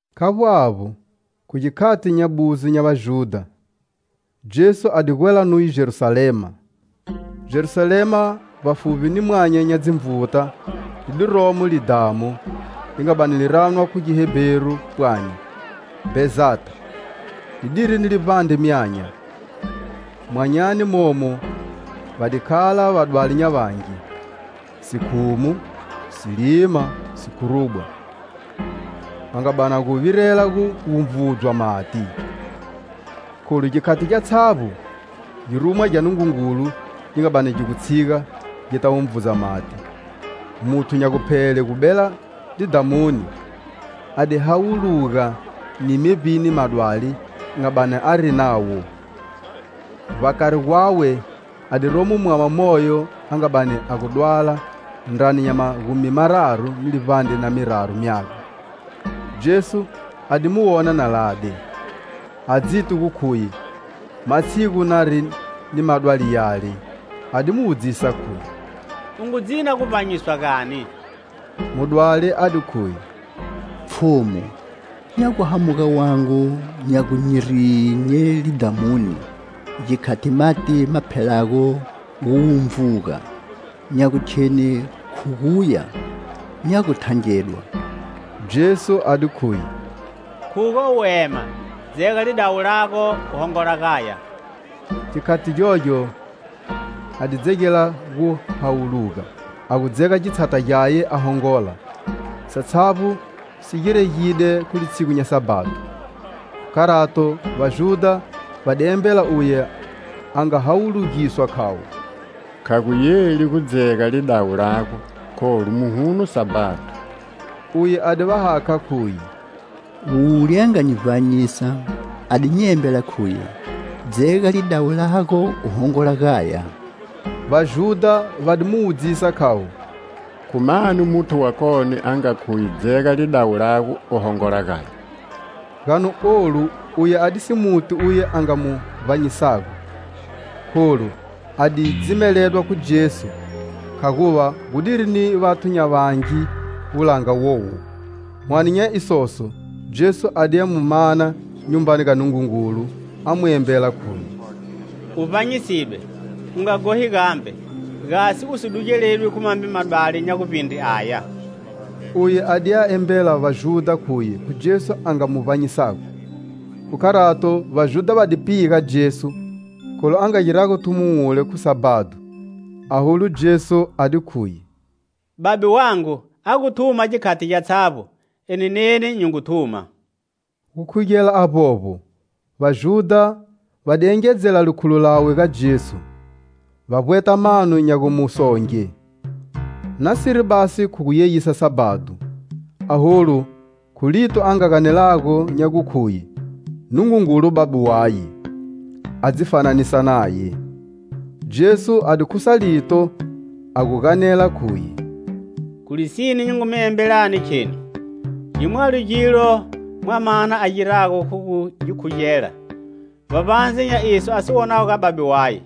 Khavbo avbo, khu gikhati nya buzo nya Vajudha, Jesu a di gwela nuye Jerusalema. Jerusalema, vbafuvbi ni mwanya nya dzinvuta li di romo lidhamu, li nga bani li ranwa khu Gihebheru pwani Bhezatha; lidiri ni livbandre myanya. Myanyani momo va di khala vadwali nya vangi: sikhumu, silima, sikhurubwa. [Va nga bani va gu virela gu wunvudzwa mati, kholu gikhati gyatshavbo girumwa gya Nungungulu gi nga bani gi gu tshiga gita wunvudza mati muthu nya guphele gu bela lidhamuni a di hawuluga ni mevbini madwali a nga bani ari nawo.] Vbakari gwawe a di romo mwama moyo a nga bani a gu dwala ndrani nya magumi mararu na livbandre na miraru myaga. Jesu, a di mu wona na lade, a dziti gu khuye matshigu nari ni madwali yale, a di mu wudzisa khuye: "U ngu dzina guvbanyiswa gani?" Mudwali a di khuye: "Pfhumu, nya gu hamuga wangu nya gu nyi rinye lidhamuni, gikhati mati maphelago guwunvuga; nya gu kheni khu guya, nya gu thangedwa." Jesu a di khuye: "Khuga u ema, dzega lidawu lago u hongola gaya." Gikhati gyogyo a di dzegela gu hawuluga, a gu dzega gitshata gyaye a hongola. Satshavbo si giregide khu litshigu nya Sabhado. Khu kharato, Vajudha va di embela uye a nga hawulugiswa khavo: "Kha gu yeli gu dzega lidawu lago, kholu muhuno Sabhado." Uye a di va hakha khuye: "Wule a nga nyi vbanyisa a di nyi embela khuye dzega lidawu lago u hongola gaya." Vajudha va di mu wudzisa khayo: "Khu mani muthu wakone a nga khuye dzega lidawu lago u hongola gaya?" Gani olu uye adisi muti uye a nga mu vbanyisago, kholu a di dzimeledwa khu Jesu, khaguva gudiri ni vathu nya vangi wulanga wowo. Hwane nya isoso, Jesu a diya mu mana Nyumbani ga Nungungulu, a mu embela khuye: "U vbanyisidwe, u nga ghohi gambe, gasi u si dugeledwi khu mambe madwali nya guvbindre aya." Uye a diya embela Vajudha khuye khu Jesu a nga mu vbanyisago. Khu kharato, Vajudha va di piga Jesu kholu a nga girago thumo wule khu Sabhado. Aholu, Jesu a di khuye: "Babe wangu a gu thuma gikhati gyatshavbo, eni neni nyi ngu thuma." Gukhugela avbovbo, Vajudha va di engedzela likhulo lawe ga Jesu, va vbweta mano nya gu mu songe, nasiri basi khu guyeyisa Sabhado, aholu khu lito a nga ganelago nya gukhuye Nungungulu Babe waye, a dzi fananisa naye. Jesu a di khusa lito a gu ganela khuye: "Khu lisine, nyi ngu mi embelani kheni: gimwalo gilo Mwamana a girago khu gu gi khugela, vbavbandze nya iso a si wonago ga Babe waye,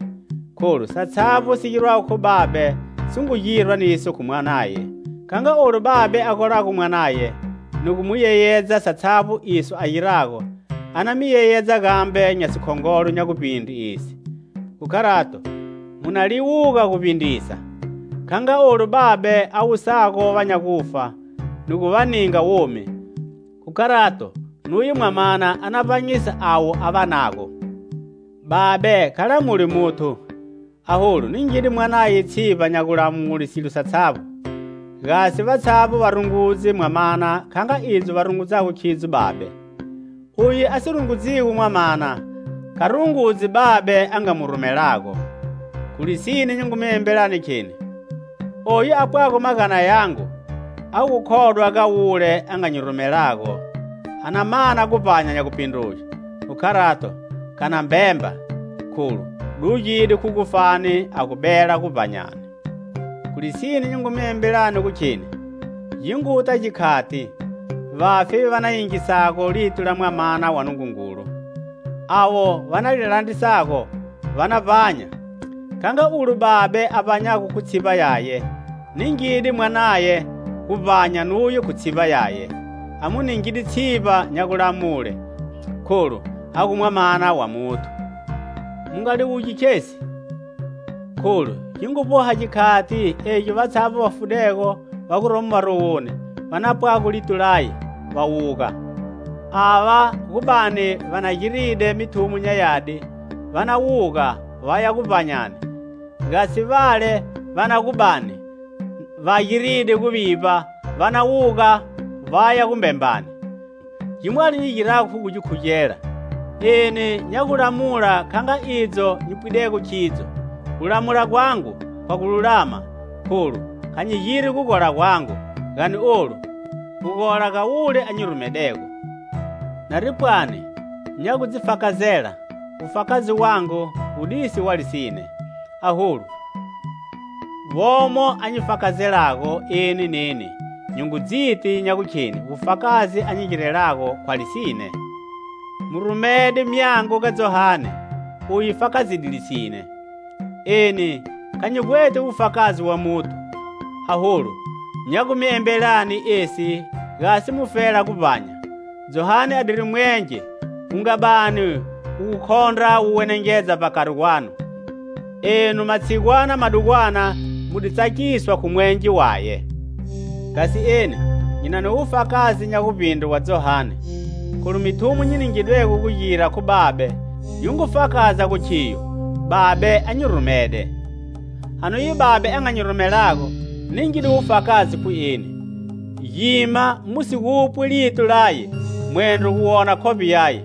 kholu satshavbo si girwago khu Babe si ngu girwa niso khu Mwanaye. Kha nga olu Babe a golago Mwanaye ni gu mu yeyedza satshavbo iso a girago, a na mi yeyedza gambe nya sikhongolo nya guvbindre esi. Khu kharato mu na liwuga guvbindrisa. Kha nga ulo Babe a wusago va nya gufa ni gu va ninga womi, kharato nuye Mwamana a na vbanyisa avo a vanago. Babe kha lamuli muthu, aholu ningide Mwanaye tshivba nya gulamule silo satshavbo, gasi vatshavbo va rungudze Mwamana kha nga idzo va rungudzago khidzo Babe. Uye a si rungudzigo Mwamana kha rungudzi Babe a nga mu rumelago. "Khu lisine, nyi ngu mi embelani kheni: oyu apwago magana yangu a gukhodwa ga wule a nga nyi rumelago a na mana guvbanya nya gupindruge. Khu kharato kha na mbemba, kholu dugide khu gufani, a gu bela guvbanyani. Khu lisine, nyi ngu mi embelani gu kheni gi nguta gikhati, vafi va na yingisago lito la Mwamana wa Nungungulu; avo va na li landrisago va na vbanya. Kha nga ulo Babe a vbanyago khu tshivba yaye, ningide Mwanaye guvbanya nuye khu tshivba yaye. A mu ningide tshivba nya gulamule, kholu a gu Mwamana wa Muthu. Mu nga liwugi khesi, kholu gi ngu vboha gikhati egi vatshavbo va fudego va gomo marowoni va napwago lito laye, va wuga: ava gu bani va na giride mithumo nya yadi, va na wuga vaya guvbanyani, gasi vale va na gu bani va giride guvivba va na wuga vaya gumbembani. "Gimwalo nyi girago khu gu gi khugela. Eni nya gu lamula kha nga idzo nyi pwidego khidzo; gulamula gwangu khwa gululama. Kholu kha nyi giri gugola gwangu, gani olu, gugola ga wule a nyi rumidego. Nari pwani nya gu dzi fakazela, wufakazi wangu wudisi wa lisine. Aholu, womo a nyi fakazelago, eni neni nyi ngu dziti gu kheni wufakazi a nyi girelago khwa lisine. "Mu rumede myango ga Johane; uye fakazide lisine. Eni kha nyi vbweti wufakazi wa muthu, aholu nya gu mi embelani esi, gasi mufela guvbanya. Johane adiri mwenge wu nga bani wu gu khondra wu wenengedza vbakari gwanu; enu, matshigwana madugwana, mu di tsakiswa khu mwenge waye. Gasi eni nyi na ni wufakazi nya guvbindre wa Johane, kholu mithumo nyi ningidwego gu gira khu Babe, yi ngu fakaza gu khiyo Babe a nyi rumede. "A nuye Babe a nga nyi rumelago ningide wufakazi khu eni. Gima mu si gupwi lito laye, mwendro gu wona khovbe yaye.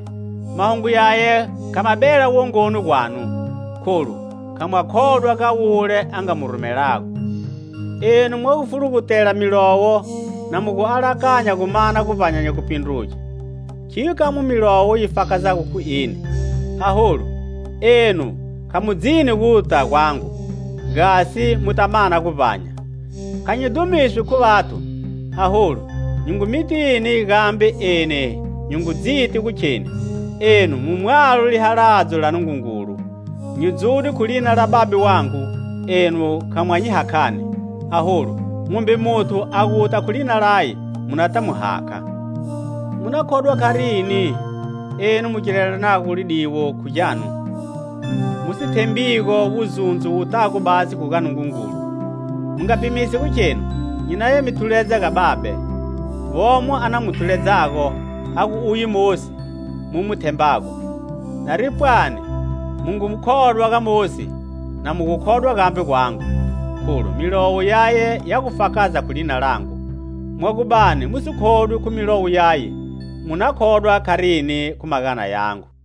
Mahungu yaye kha ma bela wongoni gwanu, kholu kha mwa khodwa ga wule a nga mu rumelago. Enu mwa gu fulugutela Milowo na mu gu alakanya gu mana guvbanya nya gupindruge; khiyo kamwe Milowo yi fakazago khu eni. Aholu enu kha mu dzini guta gwangu, gasi mu ta mana guvbanya. "Kha nyi dhumiswi khu vathu; aholu nyi ngu mitini, gambe eni nyi ngu dziti gu kheni, enu mu mwalo lihaladzo la Nungungulu. Nyi dzude khu lina la Babe wangu, enu kha mwa nyi hakhani; aholu mumbe muthu a guta khu lina laye, munata mu hakha. Mu na khodwa kharini enu mu girelanago lidiwo khu gyanu, mu si thembigo wuzundzo wutago basi khu ga Nungungulu? Mu nga pimisi gu khenu nyi naya mi thuledza ga Babe; womo a na gu mi thuledzago, a gu uye Mosi mu mu thembago. Nari pwani mu ngu khodwa ga Mosi, na mu gu khodwa gambe gwangu, kholu milowo yaye ya gu fakaza khu lina langu. Mwa gu bani mu si khodwi khu milowo yaye, mu na khodwa kharini khu magana yangu?"